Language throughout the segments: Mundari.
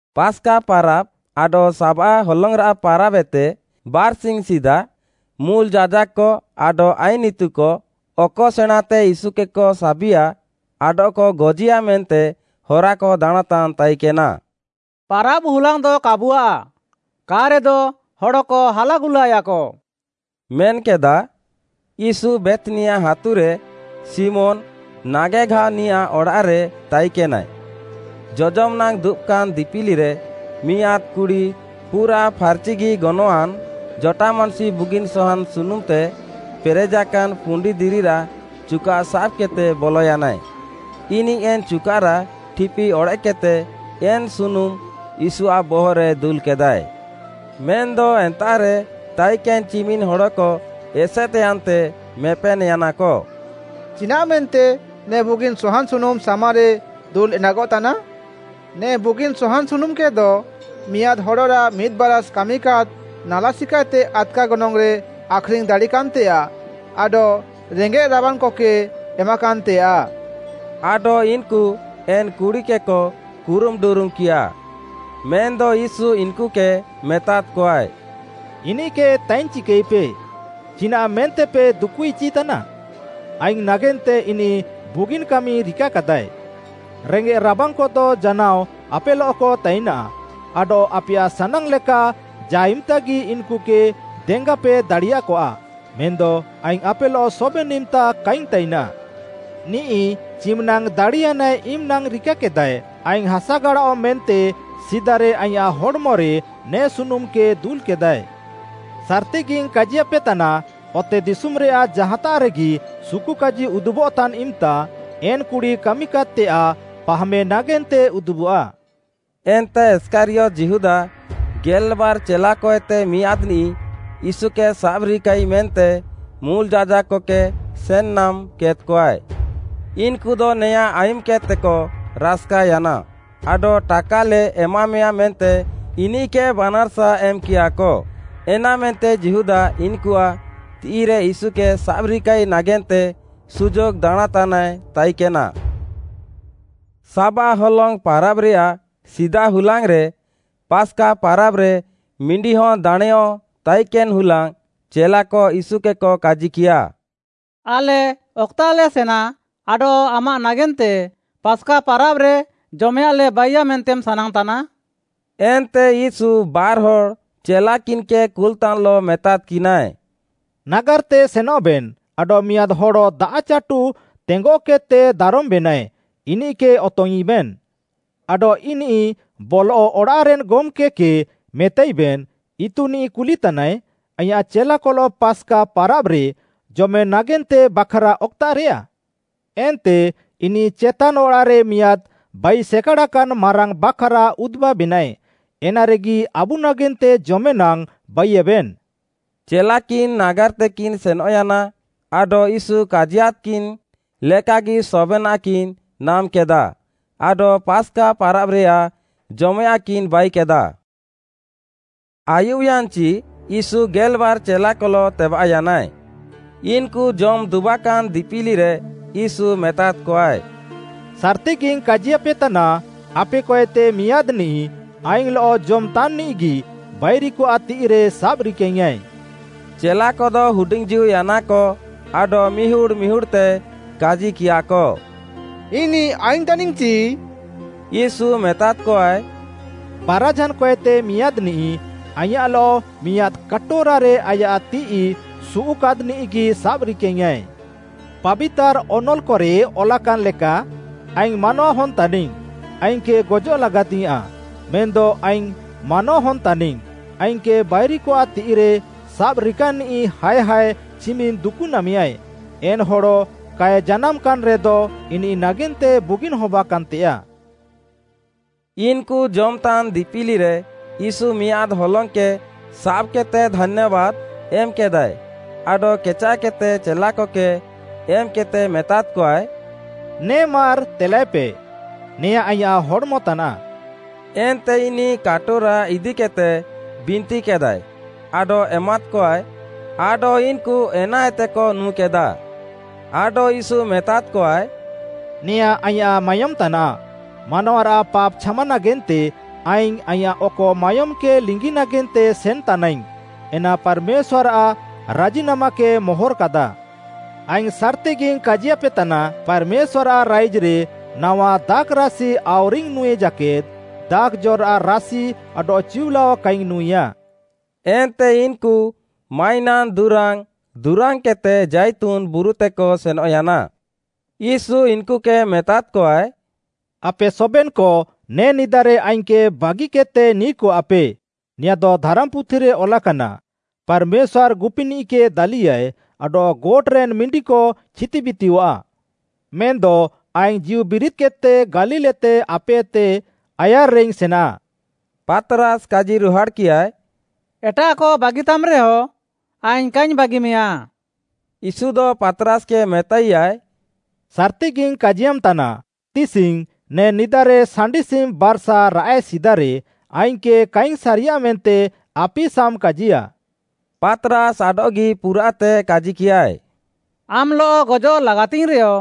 ପାସ୍‌କା ପାରାବ୍‌ ଆଡଃ ସାବାଃ ହଲଙ୍ଗ୍‌ରାଃ ପାରାବ୍‌ ଏତେ ବାର୍‌ସିଙ୍ଗ୍‌ ସିଦା, ମୁଲ୍‌ ଯାଜାକ୍‌କ ଆଡଃ ଆଇନ୍‌ ଇତୁକ ଅକ ସେଣାଁଁତେ ୟୀଶୁକେକ ସାବିଆ ଆଡଃକ ଗଜିୟା ମେନ୍ତେ ହରାକ ଦାଣାଁଁତାନ୍ ତାଇକେନା। “ପାରାବ୍‌ ହୁଲାଙ୍ଗ୍‌ଦ କାବୁଆଃ, କା'ରେଦ ହଡ଼କ ହାଲାଗୁଲାୟାକ” ମେନ୍‌କେଦା। ୟୀଶୁ ବେଥ୍‌ନିଆ ହାତୁରେ, ଶିମୋନ୍‌ ନାଗେଘାଅନିଆଃ ଅଡ଼ାଃରେ ତାଇକେନାଏ। ଜଜମ୍ ନାଙ୍ଗ୍‌ ଦୁବାକାନ୍‌ ଦିପିଲିରେ, ମିଆଁଦ୍‌ କୁଡ଼ି ପୁରାଃ ଫାର୍‌ଚି ଗନଙ୍ଗ୍‌ଆଁନ୍‌ ଜଟାମାଂସି ବୁଗିନ୍‌ ସହାନ୍‌ ସୁନୁମ୍‌ତେ ପେରେଜାକାନ୍‌ ପୁଣ୍ଡିଦିରିରାଃ ଚୁକାଃ ସାବ୍‌କେଦ୍‌ତେ ବଲୟାନାଏ। ଇନିଃ ଏନ୍‌ ଚୁକାଃରାଃ ଠିପି ଅଡ଼େଃକ୍‌କେଦ୍‌ତେ ଏନ୍‌ ସୁନୁମ୍ ୟୀଶୁଆଃ ବହଃରେ ଦୁଲ୍‌କେଦାଏ। ମେନ୍‌ଦ ଏନ୍ତାଃରେ ତାଇକେନ୍‌ ଚିମିନ୍‌ ହଡ଼କ ଏସେଦ୍‌ୟାନ୍ତେ ମେପେନ୍‌ୟାନାକ, “ଚିନାଃମେନ୍ତେ ନେ ବୁଗିନ୍‌ ସହାନ୍‌ ସୁନୁମ୍‌ ସାମାରେ ଦୁଲ୍‌ଏଣ୍ଡାଗଃତାନା? ନେ ବୁଗିନ୍‌ ସହାନ୍‌ ସୁନୁମ୍‌କେଦ ମିଆଁଦ୍‌ ହଡ଼ରାଃ ମିଦ୍‌ବାରାଷ୍‌ କାମିକାଦ୍‌ ନାଲା ସିକାଏତେ ଆଦ୍‌କା ଗନଙ୍ଗ୍‌ରେ ଆଖ୍‌ରିଙ୍ଗ୍‌ ଦାଡ଼ିକାନ୍‌ତେୟାଃ ଆଡଃ ରେଙ୍ଗେଃ ରାବାଙ୍ଗ୍‌କକେ ଏମାକାନ୍‌ତେୟାଃ।” ଆଡଃ ଇନ୍‌କୁ ଏନ୍‌ କୁଡ଼ିକେକ କୁରୁମ୍ ଡୁରୁମ୍‌କିୟାଃ। ମେନ୍‌ଦ ୟୀଶୁ ଇନ୍‌କୁକେ ମେତାଦ୍‌କଆଏ, “ଇନିଃକେ ତାଇନ୍ ଚିକାଇପେ। ଚିନାଃ, ମେନ୍ତେପେ ଦୁକୁଇଚିତାନା? ଆଇଙ୍ଗ୍‌ ନାଗେନ୍ତେ ଇନିଃ ବୁଗିନ୍‌ କାମି ରିକାକାଦାଏ। ରେଙ୍ଗେଃ ରାବାଙ୍ଗ୍‌କଦ ଜାନାଅ ଆପେଲଃକ ତାଇନା, ଆଡଃ ଆପେୟାଃ ସାନାଙ୍ଗ୍‌ ଲେକା ଜା'ଇମ୍‌ତାଗି ଇନ୍‌କୁକେ ଦେଙ୍ଗାପେ ଦାଡ଼ିୟାକଆ, ମେନ୍‌ଦ ଆଇଙ୍ଗ୍‌ ଆପେଲଃ ସବେନ୍‌ ଇମ୍‌ତା କାଇଙ୍ଗ୍‌ ତାଇନାଃ। ନିଃ ଚିମିନାଙ୍ଗ୍‌ ଦାଡ଼ିୟାନାଏ ଇମିନାଙ୍ଗ୍‌ ରିକାକେଦାଏ, ଆଇଙ୍ଗ୍‌ ହାସାଗାଡ଼ାଅଃ ମେନ୍ତେ ସିଦାରେ ଆଇଁୟାଃ ହଡ଼୍‌ମରେ ନେ ସୁନୁମ୍‌କେ ଦୁଲ୍‌କେଦାଏ। ସାର୍‌ତିଗିଙ୍ଗ୍‌ କାଜିୟାପେତାନା, ଅତେଦିଶୁମ୍‌ରେୟାଃ ଜାହାତାଃରେଗି ସୁକୁକାଜି ଉଦୁବଃତାନ୍‌ ଇମ୍‌ତା ଏନ୍‌ କୁଡ଼ି କାମିକାଦ୍‍ତେୟାଃ ପାହାମେ ନାଗେନ୍ତେ ଉଦୁବଃଆ।” ଏନ୍ତେ ଇଷ୍କାରିୟତ୍‌ ଯିହୁଦା, ଗେଲ୍‌ବାର୍‌ ଚେଲାକଏତେ ମିଆଁଦ୍‌ନିଃ, ୟୀଶୁକେ ସାବ୍‌ରିକାଇ ମେନ୍ତେ ମୁଲ୍‌ ଯାଜାକ୍‌କକେ ସେନ୍‌ନାମ୍ କେଦ୍‌କଆଏ। ଇନ୍‌କୁଦ ନେଆଁଁ ଆୟୁମ୍‌କେଦ୍‌ତେକ ରାସ୍‌କାୟାନା, ଆଡଃ ଟାକାଲେ ଏମାମେୟା ମେନ୍ତେ ଇନିଃକେକ ବାନାର୍‌ସା ଏମ୍‌କିୟାକ। ଏନାମେନ୍ତେ ଯିହୁଦା ଇନ୍‌କୁଆଃ ତିଃଇରେ ୟୀଶୁକେ ସାବ୍‍ରିକାଇ ନାଗେନ୍ତେ ସୁଯୋଗ୍‌ ଦାଣାଁଁତାନାଏ ତାଇକେନା। ସାବାଃ ହଲଙ୍ଗ୍‌ ପାରାବ୍‌ରେୟାଃ ସିଦା ହୁଲାଙ୍ଗ୍‌ରେ, ପାସ୍‌କା ପାରାବ୍‌ରେ ମିଣ୍ଡିହନ୍‌ ଦାଣେଁଅଃ ତାଇକେନ୍‌ ହୁଲାଙ୍ଗ୍‌ ଚେଲାକ ୟୀଶୁକେକ କାଜିକିୟା, “ଆଲେ ଅକ୍‌ତାଃଲେ ସେନା ଆଡଃ ଆମାଃ ନାଗେନ୍ତେ ପାସ୍‌କା ପାରାବ୍‌ରେ ଜମେଆଃଲେ ବାଇୟା ମେନ୍ତେ ସାନାଙ୍ଗ୍‌ତାନାମ୍‌?” ଏନ୍ତେ ୟୀଶୁ ବାର୍‌ହଡ଼୍‌ ଚେଲାକିନ୍‌କେ କୁଲ୍‌ତାନ୍‌ଲଃ ମେତାଦ୍‌କିନାଏ, “ନାଗାର୍‌ତେ ସେନଃବେନ୍ ଆଡଃ, ମିଆଁଦ୍‌ ହଡ଼ ଦାଆଃଚାଟୁ ତେଙ୍ଗଃକେଦ୍‌ତେ ଦାରମ୍‌ବେନାଏ, ଇନିଃକେ ଅତଙ୍ଗ୍‌ଇଁବେନ୍‌। ଆଡଃ ଇନିଃ ବଲଃ ଅଡ଼ାଃରେନ୍‌ ଗମ୍‌କେ କେ ମେତାଇବେନ୍, ଇତୁନିଃ କୁଲିତାନାଏ, ଆଇଁୟାଃ ଚେଲାକଲଃ ପାସ୍‌କା ପାରାବ୍‌ରେ ଜମେ ନାଗେନ୍ତେ ବାଖ୍‌ରା ଅକ୍‌ତାଃରେୟା? ଏନ୍ତେ ଇନିଃ ଚେତାନ୍ ଅଡ଼ାଃରେ ମିଆଁଦ୍‌ ବାଇସେକାଡ଼ାକାନ୍‌ ମାରାଙ୍ଗ୍‌ ବାଖ୍‌ରା ଉଦୁବାବେନାଏ, ଏନାରେଗି ଆବୁ ନାଗେନ୍ତେ ଜମେନାଙ୍ଗ୍‌ ବାଇୟେବେନ୍।” ଚେଲାକିନ୍ ନାଗାର୍‌ତେକିନ୍ ସେନଃୟାନା, ଆଡଃ ୟୀଶୁ କାଜିୟାଦ୍‌କିନ୍‌ ଲେକାଗି ସବେନାଃକିନ୍ ନାମ୍‌କେଦାଃ ଆଡଃ ପାସ୍‌କା ପାରାବ୍‌ରେୟାଃ ଜମେୟାଃଁକିନ୍ ବାଇକେଦାଃ। ଆୟୁବ୍‍ୟାନ୍‍ଚି ୟୀଶୁ ଗେଲ୍‌ବାର୍‌ ଚେଲାକଲଃ ତେବାଃୟାନାଏ। ଇନ୍‌କୁ ଜମ୍‌ ଦୁବାକାନ୍‌ ଦିପିଲିରେ, ୟୀଶୁ ମେତାଦ୍‌କଆଏ, “ସାର୍‌ତିଗିଙ୍ଗ୍‌ କାଜିୟାପେତାନା, ଆପେକଏତେ ମିଆଁଦ୍‌ନିଃ ଆଇଙ୍ଗ୍‌ଲଃ ଜମ୍‌ତାନ୍‌ନିଃଗି ବାଇରିକଆଃ ତିଃଇରେ ସାବ୍‍ରିକାଇଙ୍ଗ୍‌ୟାଁଏ।” ଚେଲାକଦ ହୁଡିଙ୍ଗ୍‌ଜୀଉୟାନାକ, ଆଡଃ ମିହୁଡ଼୍‌ ମିହୁଡ଼୍‌ତେ କାଜିକିୟାକ, “ଇନିଃ ଆଇଙ୍ଗ୍‌ ତାନିଙ୍ଗ୍‌ଚି?” ୟୀଶୁ ମେତାଦ୍‌କଆଏ, “ବାରାଝାନ୍‌ କଏତେ ମିଆଁଦ୍‌ନିଃ, ଆଇଁୟାଃଲଃ ମିଆଁଦ୍‌ କାଟୋରାରେ ଆୟାଃ ତିଃଇ ସୁଉଃକାଦ୍‌ନିଃଗି ସାବ୍‌ରିକାଙ୍ଗ୍‌ଆଏ। ପାବିତାର୍‌ ଅନଲ୍‌କରେ ଅଲାକାନ୍‌ ଲେକା, ଆଇଙ୍ଗ୍‌ ମାନୱାହନ୍‌ ତାନିଙ୍ଗ୍‌, ଆଇଙ୍ଗ୍‌କେ ଗଜଃଲାଗାତିୟାଃଁ। ମେନ୍‌ଦ ଆଇଙ୍ଗ୍‌ ମାନୱାହନ୍‌ ତାନିଙ୍ଗ୍‌, ଆଇଙ୍ଗ୍‌କେ ବାଇରିକଆଃ ତିଃଇରେ ସାବ୍‌ରିକାନିଃ ହାୟ୍ ହାୟ୍ ଚିମିନ୍‌ ଦୁକୁନାମେୟାଏ। ଏନ୍‌ ହଡ଼ କାଏ ଜାନାମ୍‌କାନ୍‌ରେଦ ଇନିଃ ନାଗେନ୍ତେ ବୁଗିନ୍‌ ହବାକାନ୍‌ତେୟାଃ।” ଇନ୍‌କୁ ଜମ୍‌ତାନ୍ ଦିପିଲିରେ, ୟୀଶୁ ମିଆଁଦ୍‌ ହଲଙ୍ଗ୍‌କେ ସାବ୍‌କେଦ୍‌ତେ ଧାନ୍ୟାବାଦ୍‌ ଏମ୍‌କେଦାଏ ଆଡଃ କେଚାଃକେଦ୍‌ତେ ଚେଲାକକେ ଏମ୍‌କେଦ୍‌ତେ ମେତାଦ୍‌କଆଏ, “ନେ ମାର୍‌ ତେଲାଏପେ, ନେଆଁଁ ଆଇଁୟାଃ ହଡ଼୍‌ମ ତାନାଃ।” ଏନ୍ତେ ଇନିଃ କାଟୋରା ଇଦିକେଦ୍‌ତେ ବିନ୍ତିକେଦାଏ ଆଡଃ ଏମାଦ୍‌କଆଏ, ଆଡଃ ଇନ୍‌କୁ ଏନାଏତେକ ନୁଁକେଦାଃ। ଆଡଃ ୟୀଶୁ ମେତାଦ୍‌କଆଏ, “ନେଆଁଁ ଆଇଁୟାଃ ମାୟୋମ୍‌ ତାନାଃ, ମାନୱାରାଃ ପାପ୍‌ ଛାମା ନାଗେନ୍ତେ ଆଇଙ୍ଗ୍‌ ଆଇଁୟାଃ ଅକ ମାୟୋମ୍‌କେ ଲିଙ୍ଗି ନାଗେନ୍ତେ ସେନ୍‌ତାନାଇଙ୍ଗ୍‌, ଏନା ପାର୍‌ମେଶ୍ୱାର୍‌ଆଃ ରାଜିନାମାକେ ମୋହର୍‌କାଦା।” ଆଇଙ୍ଗ୍‌ ସାର୍‌ତିଗିଙ୍ଗ୍‌ କାଜିୟାପେତାନା, “ପାର୍‌ମେଶ୍ୱାର୍‌ଆଃ ରାଇଜ୍‌ରେ ନାୱା ଦାଖ୍‌ରାସି ଆଉରିଙ୍ଗ୍‌ ନୁଁଇ ଜାକେଦ୍‌, ଦାଖ୍‌ଜ'ରାଃ ରାସି ଆଡଃ ଚିଉଲାଅ କାଇଙ୍ଗ୍‌ ନୁଁଇଆ।” ଏନ୍ତେ ଇନ୍‌କୁ ମାଇନାନ୍‌ ଦୁରାଙ୍ଗ୍‌ ଦୁରାଙ୍ଗ୍‌କେଦ୍‌ତେ ଜାଇତୁନ୍‌ ବୁରୁତେକ ସେନଃୟାନା। ୟୀଶୁ ଇନ୍‌କୁକେ ମେତାଦ୍‌କଆଏ, “ଆପେ ସବେନ୍‌କ ନେ ନିଦାରେ ଆଇଙ୍ଗ୍‌କେ ବାଗିକେଦ୍‌ତେ ନିର୍‌କଆଃପେ, ନେଆଁଦ ଧାରାମ୍‌ପୁଥିରେ ଅଲାକାନା, ‘ପାର୍‌ମେଶ୍ୱାର୍‌ ଗୁପିନିଃକେ ଦାଲିୟାଏ ଆଡଃ ଗୋଟ୍‌ରେନ୍‍ ମିଣ୍ଡିକ ଛିତିବିତିୟଃଆ।’ ମେନ୍‌ଦ ଆଇଙ୍ଗ୍‌ ଜୀଉବିରିଦ୍‌କେଦ୍‌ତେ ଗାଲିଲ୍‌ତେ ଆପେଏତେ ଆୟାର୍‌ରେଇଙ୍ଗ୍‌ ସେନା।” ପାତ୍‌ରାସ୍‌ କାଜିରୁହାଡ଼୍‌କିୟାଏ “ଏଟାଃକ ବାଗିତାମ୍‌ରେହଁ, ଆଇଙ୍ଗ୍‌ କାଇଙ୍ଗ୍‌ ବାଗିମେଆ।” ୟୀଶୁଦ ପାତ୍‌ରାସ୍‌କେ ମେତାଇୟାଏ, “ସାର୍‌ତିଗିଙ୍ଗ୍‌ କାଜିୟାମ୍‌ତାନା, ତିସିଙ୍ଗ୍‌, ନେ ନିଦାରେ ସାଣ୍ଡିସିମ୍‌ ବାର୍‌ସା ରାଆଃଏ ସିଦାରେ ଆଇଙ୍ଗ୍‌କେ କାଇଙ୍ଗ୍‌ ସାରିୟା ମେନ୍ତେ ଆପିସାମ୍ କାଜିୟା।” ପାତ୍‌ରାସ୍‌ ଆଡଃଗି ପୁରାଃତେ କାଜିକିୟାଏ, “ଆମ୍‌ଲଃ ଗଜଃ ଲାଗାତିଙ୍ଗ୍‌ରେଅ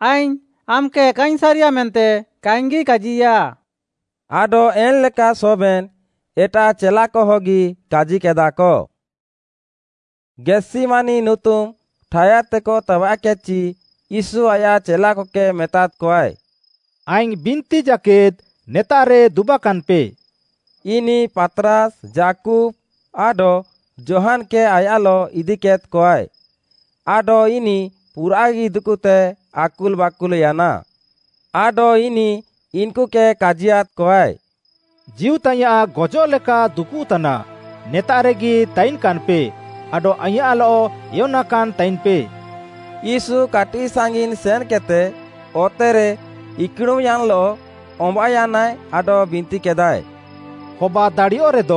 ଆଇଙ୍ଗ୍‌ ଆମ୍‌କେ କାଇଙ୍ଗ୍‌ ସାରିଆଃ ମେନ୍ତେ କାଇଙ୍ଗ୍‌ଗି କାଜିୟା।” ଆଡଃ ଏନ୍‌ଲେକା ସବେନ୍‌ ଏଟାଃ ଚେଲାକହଗି କାଜିକେଦାଃକ। ଗେଥ୍‌ସିମାନି ନୁତୁମ୍‌ ଠାୟାଦ୍‌ତେକ ତେବାଃକେଦ୍‌ଚି, ୟୀଶୁ ଆୟାଃ ଚେଲାକକେ ମେତାଦ୍‌କଆଏ, “ଆଇଙ୍ଗ୍‌ ବିନ୍ତି ଜାକେଦ୍‌ ନେତାଃରେ ଦୁବାକାନ୍‌ପେ।” ଇନିଃ ପାତ୍‌ରାସ୍‌, ଯାକୁବ୍‌, ଆଡଃ ଯୋହାନ୍‌କେ ଆୟାଃଲଃ ଇଦିକେଦ୍‌କଆଏ। ଆଡଃ ଇନିଃ ପୁରାଃଗି ଦୁକୁତେ ଆକୁଲ୍‌ବାକୁଲ୍‌ୟାନା। ଆଡଃ ଇନିଃ ଇନ୍‌କୁକେ କାଜିୟାଦ୍‍କଆଏ, “ଜୀଉତାଇୟାଁଃ ଗଜଃଲେକା ଦୁକୁଃତାନା, ନେତାଃରେଗି ତାଇନ୍‌କାନ୍‌ପେ ଆଡଃ ଆଇଁୟାଃଲଃ ଏୟନାକାନ୍‌ ତାଇନ୍‌ପେ।” ୟୀଶୁ କାଟିଃ ସାଙ୍ଗିନ୍‌ ସେନ୍‌କେଦ୍‌ତେ ଅତେରେ ଇକ୍‌ଡ଼ୁମ୍‌ୟାନ୍‌ଲଃ ଅମ୍ବାଃୟାନାଏ ଆଡଃ ବିନ୍ତିକେଦାଏ, “ହବାଦାଡ଼ିୟଃରେଦ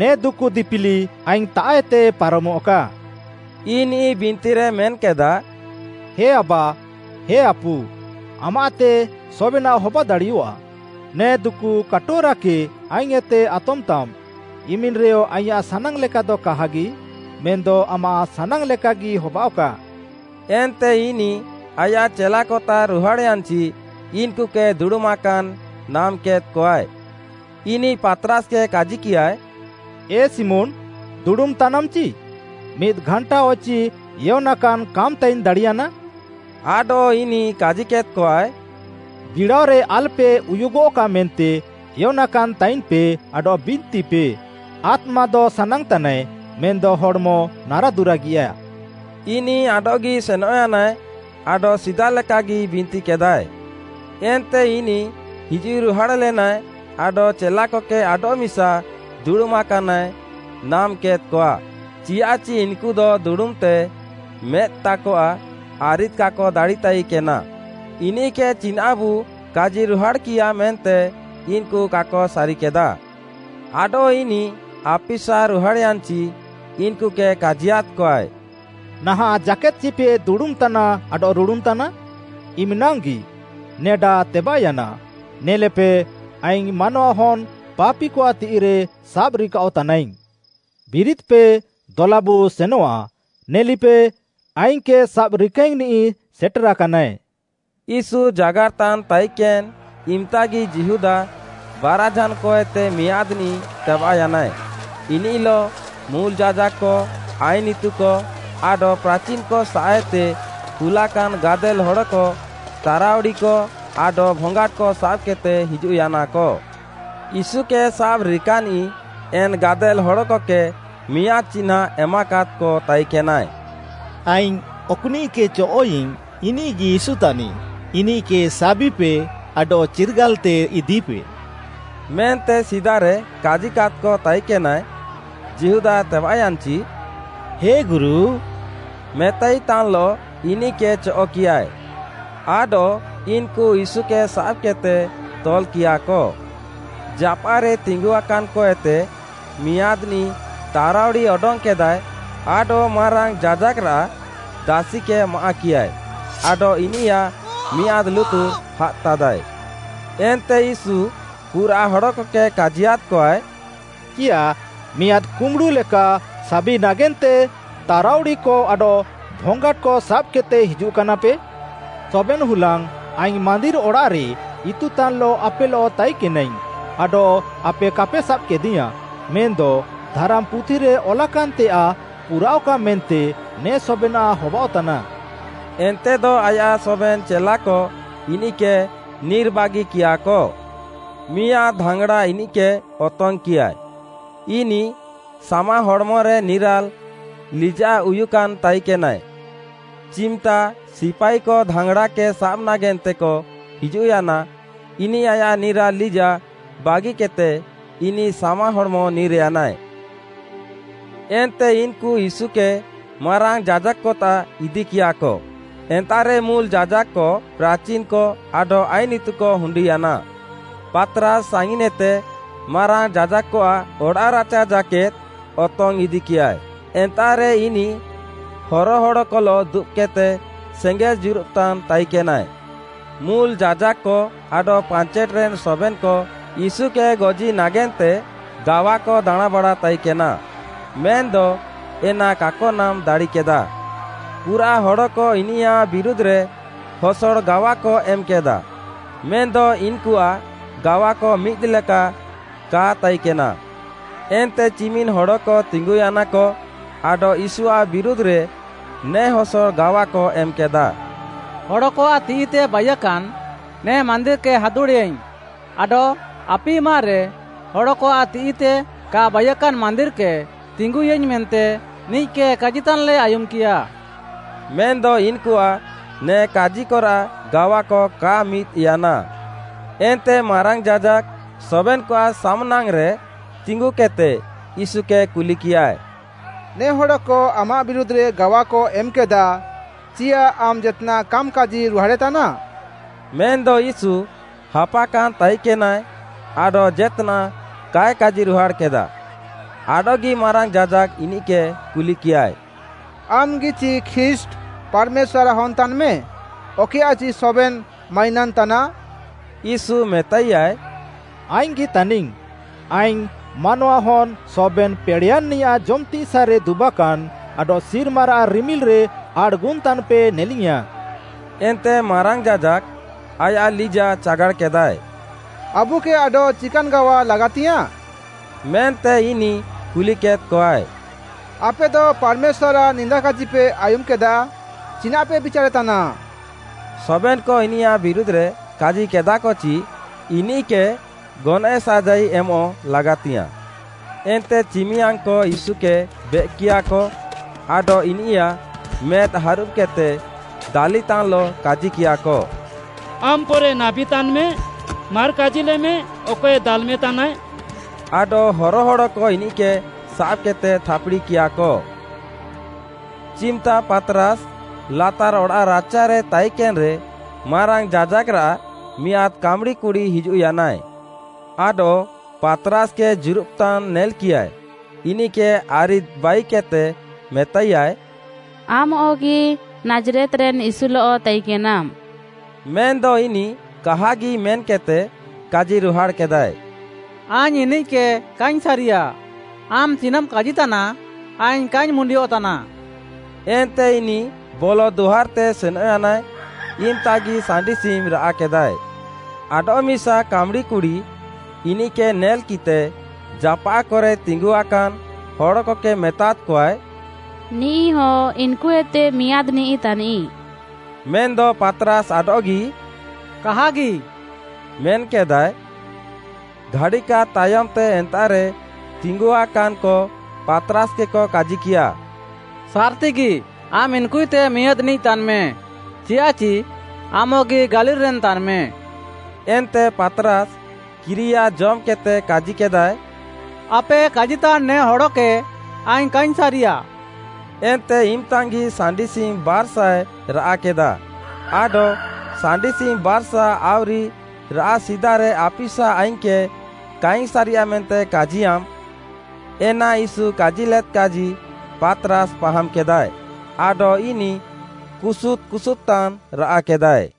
ନେ ଦୁକୁ ଦିପିଲି ଆଇଙ୍ଗ୍‌ତାଃଏତେ ପାରମଃକା।” ଇନିଃ ବିନ୍ତିରେ ମେନ୍‌କେଦା, “ହେ ଆବା, ହେ ଆପୁ, ଆମାଃତେ ସବେନାଃ ହବାଦାଡ଼ିଅଃଆ। ନେ ଦୁକୁ କାଟୋରାକେ ଆଇଙ୍ଗ୍‌ଏତେ ଆତମ୍‌ତାମ୍; ଇମିନ୍‌ରେଅ ଆଇଁୟାଃ ସାନାଙ୍ଗ୍‌ଲେକାଦ କାହାଗି, ମେନ୍‌ଦ ଆମାଃ ସାନାଙ୍ଗ୍‌ ଲେକାଗି ହବାଅଃକା।” ଏନ୍ତେ ଇନିଃ ଆୟାଃ ଚେଲାକତାଃ ରୁହାଡ଼୍‌ୟାନ୍‌ଚି ଇନ୍‌କୁକେ ଦୁଡ଼ୁମାକାନ୍‌ ନାମ୍‍କେଦ୍‍କଆଏ। ଇନିଃ ପାତ୍‌ରାସ୍‌କେ କାଜିକିୟାଏ, “ଏ ଶିମୋନ୍‌, ଦୁଡ଼ୁମ୍ ତାନାମ୍ ଚି? ମିଦ୍‌ ଘାଣ୍ଟାଅଚି ଏୟନାକାନ୍ କାମ୍‌ତାଇନ୍‌ ଦାଡ଼ିୟାନା?” ଆଡଃ ଇନିଃ କାଜିକେଦ୍‌କଆଏ, “ବିଡ଼ାଅରେ ଆଲ୍‌ପେ ଉୟୁଗଃକା ମେନ୍ତେ ଏୟନାକାନ୍ ତାଇନ୍‌ପେ ଆଡଃ ବିନ୍ତିପେ। ଆତ୍ମାଦ ସାନାଙ୍ଗ୍‌ତାନାଏ, ମେନ୍‌ଦ ହଡ଼୍‌ମ ନାରାଦୁରାଗିଆଃ।” ଇନିଃ ଆଡଃଗି ସେନଃୟାନାଏ, ଆଡଃ ସିଦାଲେକାଗି ବିନ୍ତିକେଦାଏ। ଏନ୍ତେ ଇନିଃ ହିଜୁଃରୁହାଡ଼୍‌ଲେନାଏ ଆଡଃ ଚେଲାକକେ ଆଡଃମିସା ଦୁଡ଼ୁମାକାନାଏ ନାମ୍‍କେଦ୍‍କଆ, ଚିୟାଃଚି ଇନ୍‌କୁ ଦୁଡ଼ୁମ୍‌ତେ ମେଦ୍‌ତାକଆଃ ଆରିଦ୍‌ କାକ ଦାଡ଼ିତାନ୍‌ତାଇକେନା। ଇନିଃକେ ଚିନାଃବୁ କାଜିରୁହାଡ଼୍‌କିୟା ମେନ୍ତେ ଇନ୍‌କୁ କାକ ସାରିକେଦା। ଆଡଃ ଇନିଃ ଆପିସା ରୁହାଡ଼୍‌ୟାନ୍‌ଚି, ଇନ୍‌କୁକେ କାଜିୟାଦ୍‌କଆଏ, “ନାହାଁଃ ଜାକେଦ୍‌ଚିପେ ଦୁଡ଼ୁମ୍‌ତାନା ଆଡଃ ରୁଡୁନ୍‌ତାନା? ଇମ୍‌ନାଙ୍ଗ୍‌ଗି! ନେଡା ତେବାଃୟାନା, ନେଲେପେ, ଆଇଙ୍ଗ୍‌ ମାନୱାହନ୍‌ ପାପିକଆଃ ତିଃଇରେ ସାବ୍‌ରିକାଅଃତାନାଇଙ୍ଗ୍‌। ବିରିଦ୍‌ପେ, ଦଲାବୁ ସେନଆଃ! ନେଲିପେ, ଆଇଙ୍ଗ୍‌କେ ସାବ୍‍ରିକାଇଙ୍ଗ୍‌ନିଃ ସେଟେରାକାନାଏ।” ୟୀଶୁ ଜାଗାର୍‌ତାନ୍‌ ତାଇକେନ୍‌ ଇମ୍‌ତାଗି ଯିହୁଦା, ବାରାଝାନ୍‌କଏତେ ମିଆଁଦ୍‌ନିଃ ତେବାଃୟାନାଏ। ଇନିଃଲଃ ମୁଲ୍‌ ଯାଜାକ୍‌କ, ଆଇନ୍‌ ଇତୁକ ଆଡଃ ପ୍ରାଚିନ୍‌କ ସାଃଏତେ କୁଲାକାନ୍‌ ଗାଦେଲ୍‌ ହଡ଼କ ତାରାଉଡ଼ିକ ଆଡଃ ଭଙ୍ଗାଟ୍‌କ ସାବ୍‌କେଦ୍‌ତେ ହିଜୁଃୟାନାକ। ୟୀଶୁକେ ସାବ୍‌ରିକାନିଃ ଏନ୍‌ ଗାଦେଲ୍‌ ହଡ଼କକେ ମିଆଁଦ୍‌ ଚିହ୍ନାଁ ଏମାକାଦ୍‌କ ତାଇକେନାଏ, “ଆଇଙ୍ଗ୍‌ ଅକ୍‌ନିଃକେ ଚଅଃ'ଇଙ୍ଗ୍‌, ଇନିଃଗି ୟୀଶୁ ତାନିଃ। ଇନିଃକେ ସାବିପେ ଆଡଃ ଚିର୍ଗାଲ୍‌ତେ ଇଦିପେ” ମେନ୍ତେ ସିଦାରେ କାଜିକାଦ୍‌କ ତାଇକେନାଏ। ଯିହୁଦା ତେବାଃୟାନ୍‌ଚି, “ହେ ଗୁରୁ” ମେତାଇତାନ୍‌ଲଃ ଇନିଃକେ ଚଅଃ'କିୟାଏ। ଆଡଃ ଇନ୍‌କୁ ୟୀଶୁକେ ସାବ୍‌କେଦ୍‌ତେ ତଲ୍‌କିୟାଃକ। ଜାପାଃରେ ତିଙ୍ଗୁଆକାନ୍ଏତେ ମିଆଁଦ୍‌ନିଃ ତାରାଉଡ଼ି ଅଡଙ୍ଗ୍‌କେଦାଏ ଆଡଃ ମାରାଙ୍ଗ୍‌ ଯାଜାକ୍‌ରାଃ ଦାସିକେ ମାଆଃକିୟାଏ ଆଡଃ ଇନିୟାଃ ମିଆଁଦ୍‌ ଲୁତୁର୍‍ ହାଦ୍‍ତାଦାଏ। ଏନ୍ତେ ୟୀଶୁ ପୁରାଃ ହଡ଼କକେ କାଜିୟାଦ୍‍କଆଏ, “ଚିୟାଃ, ମିଆଁଦ୍‌ କୁମ୍ୱୁଡ଼ୁଲେକା ସାବିଙ୍ଗ୍‌ ନାଗେନ୍ତେ ତାରାଉଡ଼ିକ ଆଡଃ ଭଙ୍ଗାଟ୍‌କ ସାବ୍‌କେଦ୍‌ତେ ହିଜୁଃକାନାପେ? ସବେନ୍‌ ହୁଲାଙ୍ଗ୍‌ ଆଇଙ୍ଗ୍‌ ମାନ୍ଦିର୍‌ ଅଡ଼ାଃରେ ଇତୁତାନ୍‌ଲଃ ଆପେଲଃ ତାଇକେନାଇଙ୍ଗ୍‌ ଆଡଃ ଆପେ କାପେ ସାବ୍‌କେଦିୟାଁଃ। ମେନ୍‌ଦ ଧାରାମ୍‌ପୁଥିରେ ଅଲାକାନ୍‌ତେୟାଃ ପୁରାଅଃକା ମେନ୍ତେ ନେ ସବେନାଃ ହବାଅଃତାନା।” ଏନ୍ତେଦ ଆୟାଃ ସବେନ୍‌ ଚେଲାକ ଇନିଃକେ ନିର୍‍ବାଗିକିୟାଃକ। ମିଆଁଦ୍‌ ଧାଙ୍ଗ୍‌ଡ଼ା ଇନିଃକେ ଅତଙ୍ଗ୍‌କିୟା, ଇନିଃ ସାମା ହଡ଼୍‌ମରେ ନିରାଲ୍‌ ଲିଜାଃଉୟୁକାନ୍ ତାଇକେନାଏ, ଚିମ୍‌ତା ସିପାଇକ ଧାଙ୍ଗ୍‌ଡ଼ାକେ ସାବ୍ ନାଗେନ୍ତେକ ହିଜୁଃୟାନା, ଇନିଃ ଆୟାଃ ନିରାଲ୍‌ ଲିଜାଃ ବାଗିକେଦ୍‌ତେ, ଇନିଃ ସାମାହଡ଼୍‌ମ ନିର୍‍ୟାନାଏ। ଏନ୍ତେ ଇନ୍‌କୁ ୟୀଶୁକେ ମାରାଙ୍ଗ୍‌ ଯାଜାକ୍‌କତାଃ ଇଦିକିୟାଃକ। ଏନ୍ତାଃରେ ମୁଲ୍‌ ଯାଜାକ୍‌କ, ପ୍ରାଚିନ୍‌କ ଆଡଃ ଆଇନ୍‌ ଇତୁକ ହୁଣ୍ଡିୟାନା। ପାତ୍‌ରାସ୍‌ ସାଙ୍ଗିନ୍‌ଏତେ ମାରାଙ୍ଗ୍‌ ଯାଜାକ୍‌ଆଃ ଅଡ଼ାଃରାଚା ଜାକେଦ୍‌ ଅତଙ୍ଗ୍‌ ଇଦିକିୟାଏ। ଏନ୍ତାଃରେ ଇନିଃ ହରହଡ଼କଲଃ ଦୁବ୍‌କେଦ୍‌ତେ ସେଙ୍ଗେଲ୍‌ ଜୁରୁବ୍‌ତାନ୍‌ ତାଇକେନାଏ। ମୁଲ୍‌ ଯାଜାକ୍‌କ ଆଡଃ ପାଞ୍ଚେଟ୍‌ରେନ୍ ସବେନ୍‌କ ୟୀଶୁକେ ଗଜି ନାଗେନ୍ତେ ଗାୱାକ ଦାଣାଁଁବାଡ଼ା ତାଇକେନା, ମେନ୍‌ଦ ଏନା କାକ ନାମ୍‌ ଦାଡ଼ିକେଦା। ପୁରାଃ ହଡ଼କ ଇନିୟାଃ ବିରୁଧ୍‌ରେ ହସଡ଼ ଗାୱାକ ଏମ୍‌କେଦାଃ, ମେନ୍‌ଦ ଇନ୍‌କୁଆଃ ଗାୱାକ ମିଦ୍‌ଲେକା କା ତାଇକେନା। ଏନ୍ତେ ଚିମିନ୍‌ ହଡ଼କ ତିଙ୍ଗୁୟାନାକ, ଆଡଃ ୟୀଶୁଆଃ ବିରୁଧ୍‌ରେ ନେ ହସଡ଼ ଗାୱାକ ଏମ୍‌କେଦାଃ: “ହଡ଼କଆଃ ତିଃଇତେ ବାଇୟାକାନ୍, ନେ ମାନ୍ଦିର୍‌କେ ହାଦୁଡ଼େଆଇଙ୍ଗ୍‌, ଆଡଃ ଆପିମାରେ, ହଡ଼କଆଃ ତିଃଇତେ କା ବାଇୟାକାନ୍‌ ମାନ୍ଦିର୍‌କେ ତିଙ୍ଗୁୟାଇଙ୍ଗ୍‌ ମେନ୍ତେ ନିଃକେ କାଜିତାନ୍‌ଲେ ଆୟୁମ୍‌କିୟା।” ମେନ୍‌ଦ ଇନ୍‌କୁଆଃ ନେ କାଜିକରାଃ ଗାୱାକ କା ମିଦ୍‌ୟାନା। ଏନ୍ତେ ମାରାଙ୍ଗ୍‌ ଯାଜାକ୍‌, ସବେନ୍‌କଆଃ ସାମ୍‌ନାଙ୍ଗ୍‌ରେ ତିଙ୍ଗୁକେଦ୍‌ତେ ୟୀଶୁକେ କୁଲିକିୟାଏ, “ନେ ହଡ଼କ ଆମାଃ ବିରୁଧ୍‌ରେ ଗାୱାକ ଏମ୍‌କେଦାଃ, ଚିୟାଃ ଆମ୍‌ ଜେତ୍‌ନାଃ କାମ୍‌କାଜି ରୁହାଡ଼େତାନା?” ମେନ୍‌ଦ ୟୀଶୁ ହାପାକାନ୍ ତାଇକେନାଏ ଆଡଃ ଜେତ୍‌ନାଃ କାଏ କାଜିରୁହାଡ଼୍‌କେଦା। ଆଡଃଗି ମାରାଙ୍ଗ୍‌ ଯାଜାକ୍‌ ଇନିଃକେ କୁଲିକିୟାଏ, “ଆମ୍‌ଗି ଚି ଖ୍ରୀଷ୍ଟ୍‌, ପାର୍‌ମେଶ୍ୱାର୍‌ରାଃ ହନ୍‌ ତାନ୍‌ମେ, ଅକଏୟାଃଚି ସବେନ୍‌ ମାଇନାନ୍‌ ତାନାଃ?” ୟୀଶୁ ମେତାଇୟାଏ, “ଆଇଙ୍ଗ୍‌ଗି ତାନିଙ୍ଗ୍‌। ଆଇଙ୍ଗ୍‌ ମାନୱାହନ୍‌ ସବେନ୍‌ ପେଡ଼େୟାନ୍‌ନିୟାଃ ଜମ୍‌ତିସାଃରେ ଦୁବାକାନ୍‌ ଆଡଃ ସିର୍ମାରାଃ ରିମିଲ୍‌ରେ ଆଡ଼୍‌ଗୁନ୍‌ତାନ୍‌ପେ ନେଲିଙ୍ଗ୍‌ୟାଁ।” ଏନ୍ତେ ମାରାଙ୍ଗ୍‌ ଯାଜାକ୍‌, ଆୟାଃ ଲିଜାଃ ଚାଗାଡ଼୍‌କେଦାଏ। “ଆବୁକେ ଆଡଃ ଚିକାନ୍‌ ଗାୱା ଲାଗାତିୟାଃଁ?” ମେନ୍ତେ ଇନିଃ କୁଲିକେଦ୍‌କଆଏ। “ଆପେଦ ପାର୍‌ମେଶ୍ୱାର୍‌ଆଃ ନିନ୍ଦାକାଜିପେ ଆୟୁମ୍‌କେଦା। ଚିନାଃପେ ବିଚାରେତାନା?” ସବେନ୍‌କ ଇନିୟାଃ ବିରୁଧ୍‌ରେ କାଜିକେଦାଃକ ଚି ଇନିଃକେ ଗନଏଃ ସାଜାଇ ଏମଃ ଲାଗାତିଙ୍ଗ୍‌ୟାଁଃ। ଏନ୍ତେ ଚିମିୟାଙ୍ଗ୍‌କ ୟୀଶୁକେ ବେଏକ୍‌କିୟାଃକ, ଆଡଃ ଇନିୟାଃ ମେଦ୍‌ ହାରୁବ୍‌କେଦ୍‌ତେ ଦାଲିତାନ୍‌ଲଃ କାଜିକିୟାଃକ, “ଆମ୍‌ ପରେ ନାବୀ ତାନ୍‌ମେ, ମାର୍‌ କାଜିଲେମେ, ଅକଏ ଦାଲ୍‌ମେତାନାଏ।” ଆଡଃ ହରହଡ଼କ ଇନିଃକେ ସାବ୍‌କେଦ୍‌ତେ ଥାପ୍‌ଡ଼ିକିୟାଃକ। ଚିମ୍‌ତା ପାତ୍‌ରାସ୍‌ ଲାତାର୍‌ ଅଡ଼ାଃରାଚାରେ ତାଇକେନ୍‌ରେ, ମାରାଙ୍ଗ୍‌ ଯାଜାକ୍‌ରାଃ ମିଆଁଦ୍‌ କାମ୍‌ଡ଼ିକୁଡ଼ି ହିଜୁଃୟାନାଏ। ଆଡଃ ପାତ୍‌ରାସ୍‌କେ ଜୁରୁବ୍‌ତାନ୍‌ ନେଲ୍‌କିୟାଏ, ଇନିଃକେ ଆରିଦ୍‍ବାଇକେଦ୍‍ତେ ମେତାଇୟାଏ, “ଆମ୍‌ଅଗି ନାଜ୍‌ରେତ୍‌ରେନ୍‌, ୟୀଶୁଲଃ ତାଇକେନାମ୍‌।” ମେନ୍‌ଦ ଇନିଃ କାହାଗି ମେନ୍‍କେଦ୍‌ତେ, କାଜିରୁହାଡ଼୍‌କେଦାଏ, “ଆଇଙ୍ଗ୍‌ ଇନିଃକେ କାଇଙ୍ଗ୍‌ ସାରିୟା। ଆମ୍‌ ଚିନାଃମ୍‌ କାଜିତାନା ଆଇଙ୍ଗ୍‌ କାଇଙ୍ଗ୍‌ ମୁଣ୍ଡିଅଃତାନାଃ।” ଏନ୍ତେ ଇନିଃ ବଲଃଦୁଆର୍‍ତେ ସେନଃୟାନାଏ, ଇମ୍‌ତାଗି ସାଣ୍ଡିସିମ୍‌ ରାଆଃକେଦାଏ। ଆଡଃମିସା କାମ୍‌ଡ଼ିକୁଡ଼ି ଇନିଃକେ ନେଲ୍‌କିଃତେ, ଜାପାଃକରେ ତିଙ୍ଗୁଆକାନ୍‌ ହଡ଼କକେ ମେତାଦ୍‌କଆଏ, “ନିଃଇହ ଇନ୍‌କୁଏତେ ମିଆଁଦ୍‌ନିଃ ତାନିଃ।” ମେନ୍‌ଦ ପାତ୍‌ରାସ୍‌ ଆଡଃଗି “କାହାଗି” ମେନ୍‍କେଦାଏ। ଘାଡ଼ିକାଦ୍‌ ତାୟମ୍‌ତେ ଏନ୍ତାଃରେ ତିଙ୍ଗୁଆକାନ୍‍କ ପାତ୍‌ରାସ୍‌କେକ କାଜିକିୟା, “ସାର୍‌ତିଗି, ଆମ୍‌ ଇନ୍‌କୁଏତେ ମିଆଁଦ୍‌ନିଃ ତାନ୍‌ମେ, ଚିୟାଃଚି ଆମ୍‌ଅଗି ଗାଲିଲ୍‌ରେନ୍ ତାନ୍‌ମେ।” ଏନ୍ତେ ପାତ୍‌ରାସ୍‌ କିରିୟା ଜମ୍‍କେଦ୍‍ତେ କାଜିକେଦାଏ, “ଆପେ କାଜିତାନ୍ ନେ ହଡ଼କେ ଆଇଙ୍ଗ୍‌ କାଇଙ୍ଗ୍‌ ସାରିଆଃ।” ଏନ୍ତେ ଇମ୍‌ତାଙ୍ଗ୍‌ଗି ସାଣ୍ଡିସିମ୍‌ ବାର୍‍ସାଏ ରାଆଃକେଦାଃ, ଆଡଃ “ସାଣ୍ଡିସିମ୍‌ ବାର୍‌ସା ଆଉରି ରାଆଃ ସିଦାରେ ଆପିସା ଆଇଙ୍ଗ୍‌କେ କାଇଙ୍ଗ୍‌ ସାରିଆ ମେନ୍ତେ କାଜିୟାମ୍‌,” ଏନା ୟୀଶୁ କାଜିଲେଦ୍‌କାଜି ପାତ୍‌ରାସ୍‌ ପାହାମ୍‍କେଦାଏ। ଆଡଃ ଇନିଃ କୁସୁଦ୍‌ କୁସୁଦ୍‍ତାନ୍ ରାଆଃକେଦାଏ।